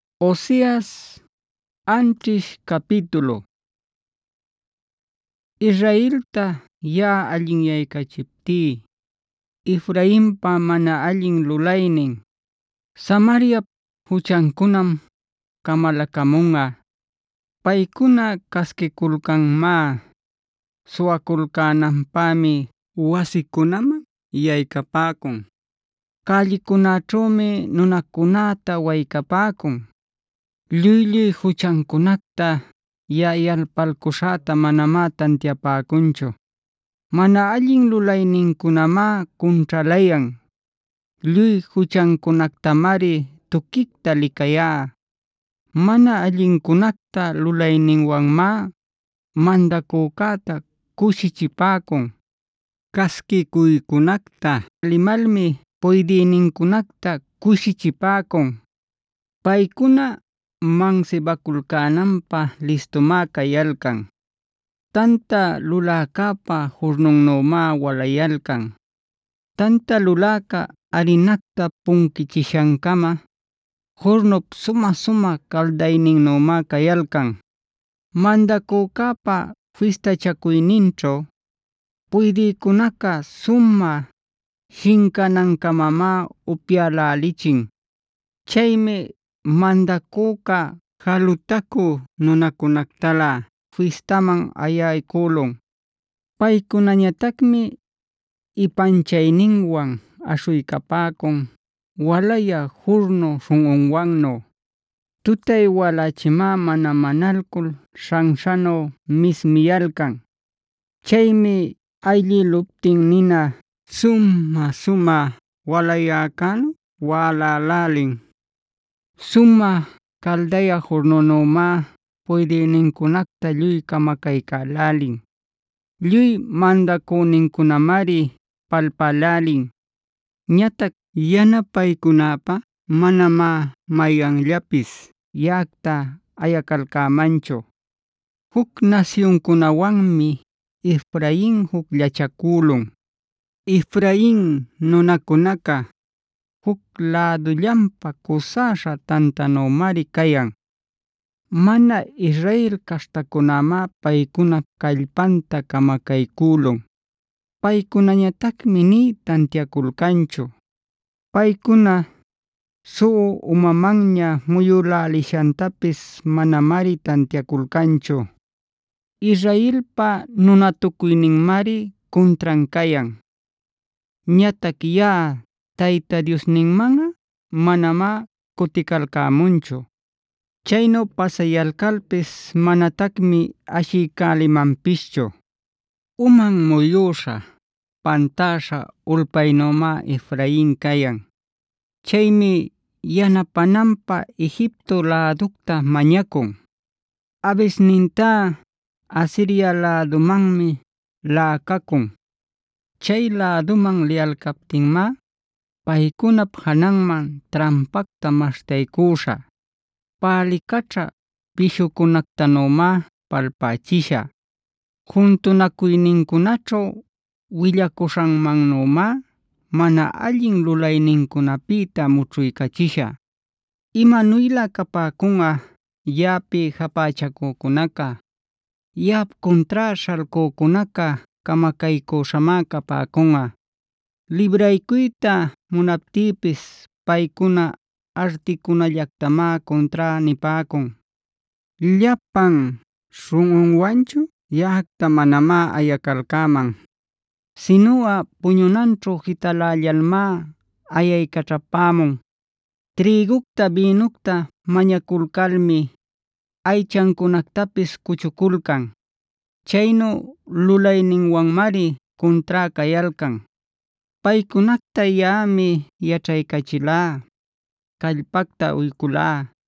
“Cuyaśhá nunäcunacta allinman muyuycachiptí, Israelta yaꞌa allinyaycachiptí, Efrainpa mana allin lulaynin, Samariapa juchancunam camalacamunꞌa. Paycuna casquiculcanmá. Suwaculcänanpämi wasicunaman yaycapäcun. Cällicunäćhümi nunacunäta waycapäcun. Lluy-lluy juchancunacta yaꞌa yalpalcuśhäta manamá tantiapäcunchu. Mana allin lulaynincunamá cunćhalayan. Lluy juchancunactamari tuquicta licayá. “Mana allincunacta lulayninwanmá mandacücäta cushichipäcun. Casquicuycunacta limalmi puydïnincunacta cushichipäcun. Paycuna mansibaculcänanpä listumá cayalcan. Tanta luläcäpa jurnunnümá walayalcan. Tanta luläca arinacta punquishancama, jurnup sumä-sumä caldayninnümá cayalcan. “Mandacücäpa fistachacuyninćhu puydïcunaca sumä shincanancamamá upyälälichin. Chaymi mandacüca jalutacü nunacunätalä fistanman ayaycülun. Paycunañatacmi ipanchayninwan aśhuycapäcun walayä jurnu śhunꞌunwannu. Tutay walächimá mana manalcul śhanśhanu mismiyalcan. Chaymi ayllïluptin nina sumä-sumä walayäcänu wälälälin. Sumä caldayä jurnunümá puydïnincunacta lluy camacaycälälin. Lluy mandacünincunamari palpälälin. Ñatac yanapaycunäpä manamá mayanllapis yaꞌacta ayacalcämanchu. “Juc nasyuncunäwanmi Efrain jucllachacülun. Efrain nunacunaca, juc lädullanpa cusäśha tantanümari cayan. Mana Israel caśhtacunämá paycunap callpanta camacaycülun. Paycunañatacmi nï tantiaculcanchu. Paycuna suꞌu umamanña muyülälishantapis manamari tantiaculcanchu. “Israelpa nunatucuyninmari cuntran cayan. Ñatac yaꞌa Tayta Diosninmanꞌa manamá cuticalcämunchu; chaynu pasayalcalpis manatacmi ashiycälimanpischu. Uman muyüśha pantäśha ulpaynümá Efrain cayan. Chaymi yanapänanpä Egipto läducta mañacun; abisnintá Asiria lädumanmi laꞌacacun. Chay läduman liyalcaptinmá paycunap jananman trampacta maśhtaycüśhä. Pälicaćhä pishucunätanümá palpächishä. Juntunacuynincunaćhu willacuśhanmannümá mana allin lulaynincunapïta mućhuycachishä. “Imanuylä capäcunꞌa, yaꞌapi japächacücunaca. Yaꞌap cuntrá śhalcücunaca camacaycüśhamá capäcunꞌa. Libraycuyta munaptïpis paycuna articunallactamá cuntrá nipäcun. Llapan śhunꞌunwanchu yaꞌacta manamá ayacalcäman, sinuꞌa puñunanćhu jitalällalmá ayaycaćhapämun. Trïgucta, bïnucta mañaculcalmi aychancunactapis cuchuculcan.bc Chaynu lulayninwanmari cuntrá cayalcan. Paycunacta yaꞌami yaćhaycachilá, callpacta uyculá.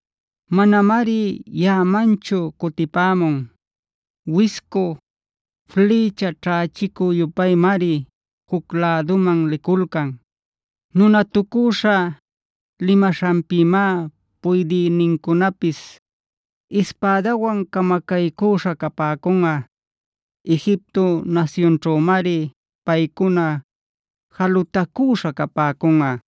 Manamari yaꞌamanchu cutipämun. Wiscu flïcha ćhächicu-yupaymari juc läduman liculcan; nunatucüśha limaśhanpïmá puydïnincunapis ispädawan camacaycüśha capäcunꞌa. Egipto nasyunćhümari paycuna jalutacüśha capäcunꞌa.